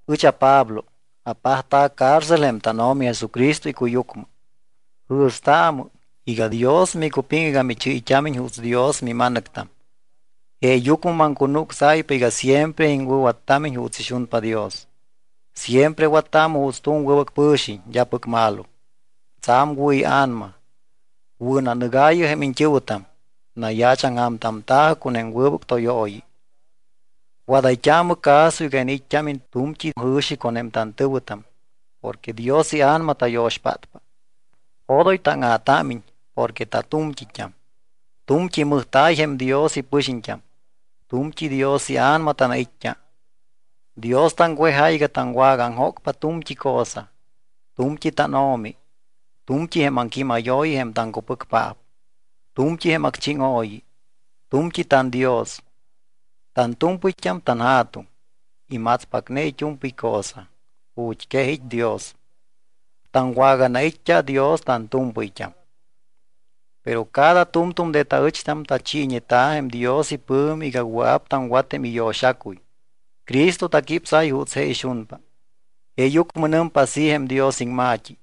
Ɨch aPablo apajta̱ cárcel jém tánO̱mi Jesucristo icuyucmɨ. Jɨ̱staamɨ iga Dios micupiŋ iga michɨ́yt́ámiñ juuts Dios mima̱nɨctam. Jeeyucmɨ maŋcunucsáypa iga siempre iŋwɨ̱wattámiñ juuts ixunpa Dios. Siempre wattaamɨ juuts tu̱m wɨbɨc pɨ̱xiñ, d́apɨc malo, tsa̱m wɨ̱ ia̱nama. Wɨ̱nanɨgaayɨ jém iñt́ɨ̱wɨtam, nayaachaŋja̱mtamta̱jɨ con jém wɨbɨc tóyooyi. Wadayt́aamɨ caso iga iniit́t́ámiñ tu̱mt́i jɨ̱xi con jém tantɨ̱wɨtam porque Dios iA̱nama tayo̱xpátpa. Odoy táŋa̱támiñ porque tatu̱mt́it́am. Tu̱mt́i mɨjta̱y jém Dios ipɨxiñt́am. Tu̱mt́i Dios iA̱nama tanait́t́a. Dios taŋwejáy iga taŋwagaaŋjócpa tu̱mt́i cosa. Tu̱mt́i tánO̱mi, tu̱mt́i jém aŋquímayooyi jém taŋcupɨcpaap, tu̱mt́i jém acchíŋooyi. Tu̱mt́i tanDios, tantu̱mpɨyt́am tanJa̱tuŋ. Imatspacne it́u̱mpɨy cosa. Ju̱t́ quej it́ Dios. Taŋwaganait́t́a Dios tantu̱mpɨyt́am. Pero cada tu̱mtu̱m de taɨcht́am tachiiñeta̱ jém Dios ipɨ̱mi iga wɨa̱p taŋwat jém iyo̱xacuy, Cristo taquípsáy juuts je ixunpa. Jeeyucmɨ nɨmpa así jém Dios iŋma̱t́i: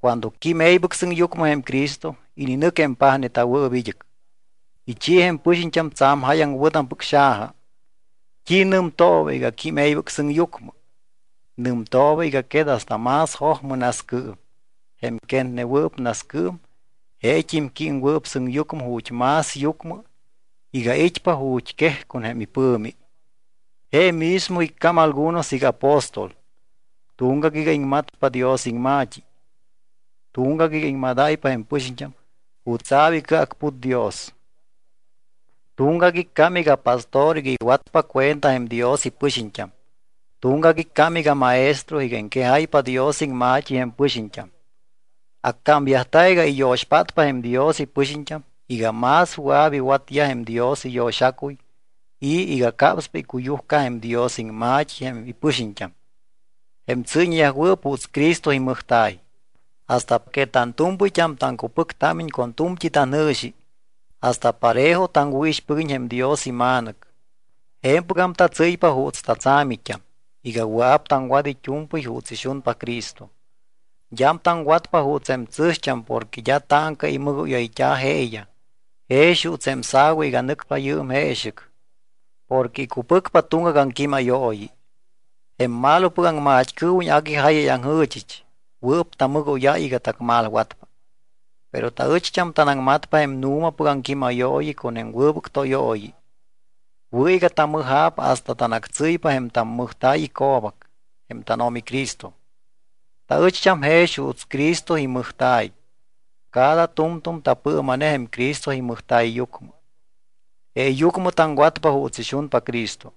Cuando quím e̱ybɨc sɨŋyucmɨ jém Cristo, ininɨc jém pajneta̱wɨɨp id́ɨc. Ichi jém pɨxiñt́am tsa̱m jáyaŋ wɨ̱tampɨc xaja. ¿T́i nɨmtooba iga: “Quím e̱ybɨc sɨŋyucmɨ”? Nɨmtooba iga quet hasta más jojmɨ nascɨɨm. Jém quetwɨɨp nascɨɨm, jeet́im jém químwɨɨp sɨŋyucmɨ ju̱t́ más yucmɨ iga it́pa ju̱t́ quej con jém ipɨ̱mi. Je mismo iccám algunos iga apóstol, tuŋgac iga iŋmatpa Dios iŋma̱t́i, tuŋgac iga iŋmadáypa jém pɨxiñt́am jutsa̱p icɨacput Dios, tuŋgac iccám iga pastor iga iwatpa cuenta jém Dios ipɨxiñt́am, tuŋgac iccám iga maestro iga iŋquejáypa Dios iŋma̱t́i jém pɨxiñt́am. Accámyajta̱ iga iyo̱xpátpa jém Dios ipɨxiñt́am iga más wɨa̱p iwatyaj jém Dios iyo̱xacuy y iga capspa icuyujca jém Dios iŋma̱t́i jém ipɨxiñt́am, jém tsɨ́yñeyajwɨɨp juuts Cristo imɨjta̱y. Hasta que tantu̱mpɨyt́am taŋcupɨctámiñ con tu̱mt́i tanjɨ̱xi, hasta parejo taŋwɨ̱ixpɨguiñ jém Dios iMa̱nɨc. Je̱mpɨgam tatsɨ́ypa juuts tatsa̱mit́am, iga wɨa̱p taŋwat it́u̱mpɨy juuts ixunpa Cristo. D́am taŋwatpa juuts jém tsɨ̱xt́am porque d́a táŋca imɨgóyayt́a̱ jeeyaj jex juuts jém sa̱wa iga nɨcpa yɨɨm jeexɨc, porque icupɨcpa tuŋgac aŋquímayooyi. Jém malopɨc aŋmat́cɨɨwiñ agui jáyayaŋjɨ̱chɨch, wɨɨp tamɨgóyáy iga tacmalwatpa. Pero taɨcht́am tanaŋmatpa jém nu̱mapɨc aŋquímayooyi con jém wɨbɨc tóyooyi. Wɨ̱ iga tamɨja̱p hasta tanactsɨ́ypa jém tammɨjta̱y ico̱bac, jém tánO̱mi Cristo. Taɨcht́am jex juuts Cristo imɨjta̱y. Cada tu̱mtu̱m tapɨɨma̱ne jém Cristo imɨjta̱yyucmɨ. Jeeyucmɨ taŋwatpa juuts ixunpa Cristo,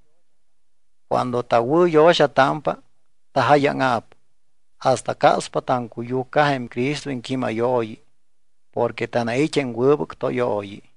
cuando tawɨ̱yo̱xatámpa, tajáyaŋa̱p, hasta capspa taŋcuyujca jém Cristo iŋquímayooyi porque tanait́ jém wɨbɨc tóyooyi.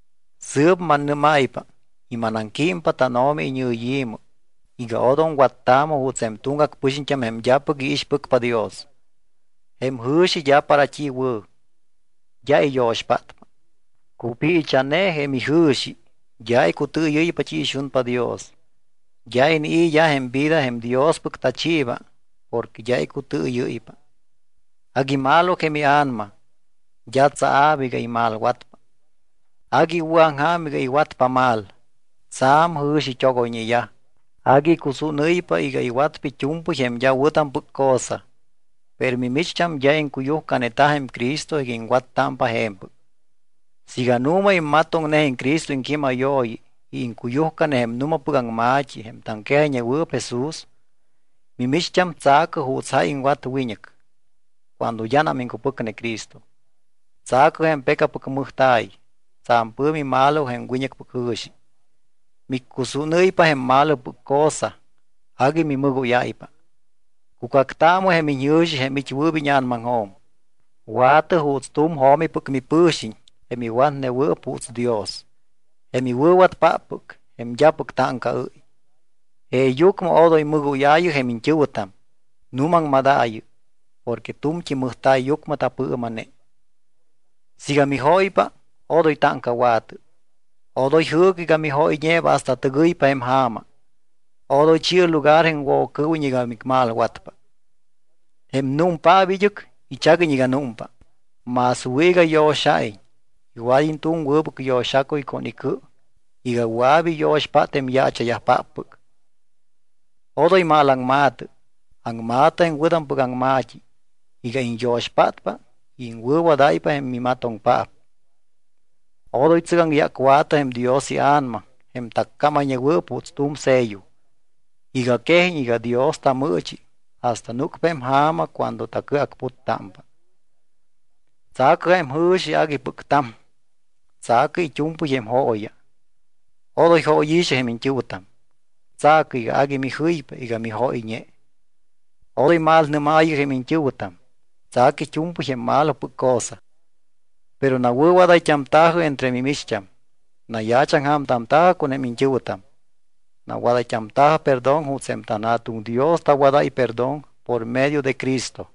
Sɨɨp mannɨ́máypa y manaŋquímpa tánO̱mi iñɨyi̱mɨ iga odom wattaamɨ juuts jém tuŋgac pɨxiñt́am jém d́apɨc iixpɨcpa Dios. Jém ijɨ̱xi d́a para t́i wɨ̱, d́a iyo̱xpátpa. Cupiicha̱ne jém ijɨ̱xi, d́a icutɨɨyɨ́ypa t́i ixunpa Dios. D́a inii̱yaj jém vida jém Diospɨc tachiiba porque d́a icutɨɨyɨ́ypa, agui malo jém ia̱nama. D́a tsaa̱p iga imalwatpa. Agui iwɨ̱aŋja̱m iga iwatpa mal, tsa̱m jɨ̱xit́ogoyñeyaj. Agui icusúnɨ́ypa iga iwatpa it́u̱mpɨy jém d́a wɨ̱tampɨc cosa. Pero mimicht́am d́a iŋcuyujcaneta jém Cristo iga iŋwattámpa je̱mpɨc, siiga nu̱ma immatoŋne jém Cristo iŋquímayooyi y iŋcuyujcane jém nu̱mapɨc aŋma̱t́i jém taŋquejayñewɨɨp Jesús. Mimicht́am tsa̱cɨ juuts jáy iŋwat wiñɨc cuando d́anam iŋcupɨcne Cristo. Tsa̱cɨ jém pecapɨc mɨjta̱y. Tsa̱m pɨ̱mi malo jém wiñɨcpɨc jɨ̱xi, miccusúnɨ́ypa jém malopɨc cosa agui mimɨgóyáypa. Cucactaamɨ jém iñjɨ̱xi jém it́wɨɨp íña̱namaŋjo̱m. Wa̱tɨ juuts tu̱m jo̱mipɨc mipɨ̱xiñ, jém iwatnewɨɨp juuts Dios, jém iwɨ̱watpáppɨc, jém d́apɨc táŋcaɨ́y. Jeeyucmɨ odoy mɨgóyaayɨ jém iñt́ɨ̱wɨtam, nuumaŋmadaayɨ. Porque tu̱mt́i mɨjta̱yyucmɨ tapɨɨma̱ne. Siiga mijóypa, odoy táŋcawa̱tɨ. Odoy jɨɨcɨ iga mijóyñeeba hasta tɨgɨypa jém ja̱ma. Odoy chi̱ɨ lugar jém Woccɨɨwiñ iga micmalwatpa. Jém númpaap id́ɨc ichaguiñ iga númpa, más wɨ̱ iga yo̱xa̱iñ. Iwad́iñ tu̱m wɨbɨc yo̱xacuy con icɨ iga wɨa̱p iyo̱xpát jém yaacha̱yajpáppɨc. Odoy malaŋma̱tɨ. Aŋma̱tɨ jém wɨ̱tampɨc aŋma̱t́i iga iñyo̱xpátpa y iŋwɨ̱wadáypa jém mimatoŋpaap. Odoy tsɨgaŋyácwa̱tɨ jém Dios iA̱nama, jém taccámayñeta̱wɨɨp juuts tu̱m sello, iga quejiñ iga Dios tamɨɨchi hasta núcpa jém ja̱ma cuando tacɨacputtámpa. Tsa̱cɨ jém jɨ̱xi aguipɨc ta̱m. Tsa̱cɨ it́u̱mpɨy jém jooya. Odoy jóyi̱xɨ jém iñt́ɨ̱wɨtam. Tsa̱cɨ iga agui mijɨypa iga mijóyñe. Odoy malnɨ́maayɨ jém iñt́ɨ̱wɨtam, tsa̱cɨ it́u̱mpɨy jém malopɨc cosa. Pero nawɨ̱wadayt́amta̱jɨ entre mimicht́am. Nayaachaŋja̱mtamta̱jɨ con jém iñt́ɨ̱wɨtam. Nawadayt́amta̱jɨ perdón juuts jém tanJa̱tuŋ Dios tawadáy perdón por medio de Cristo.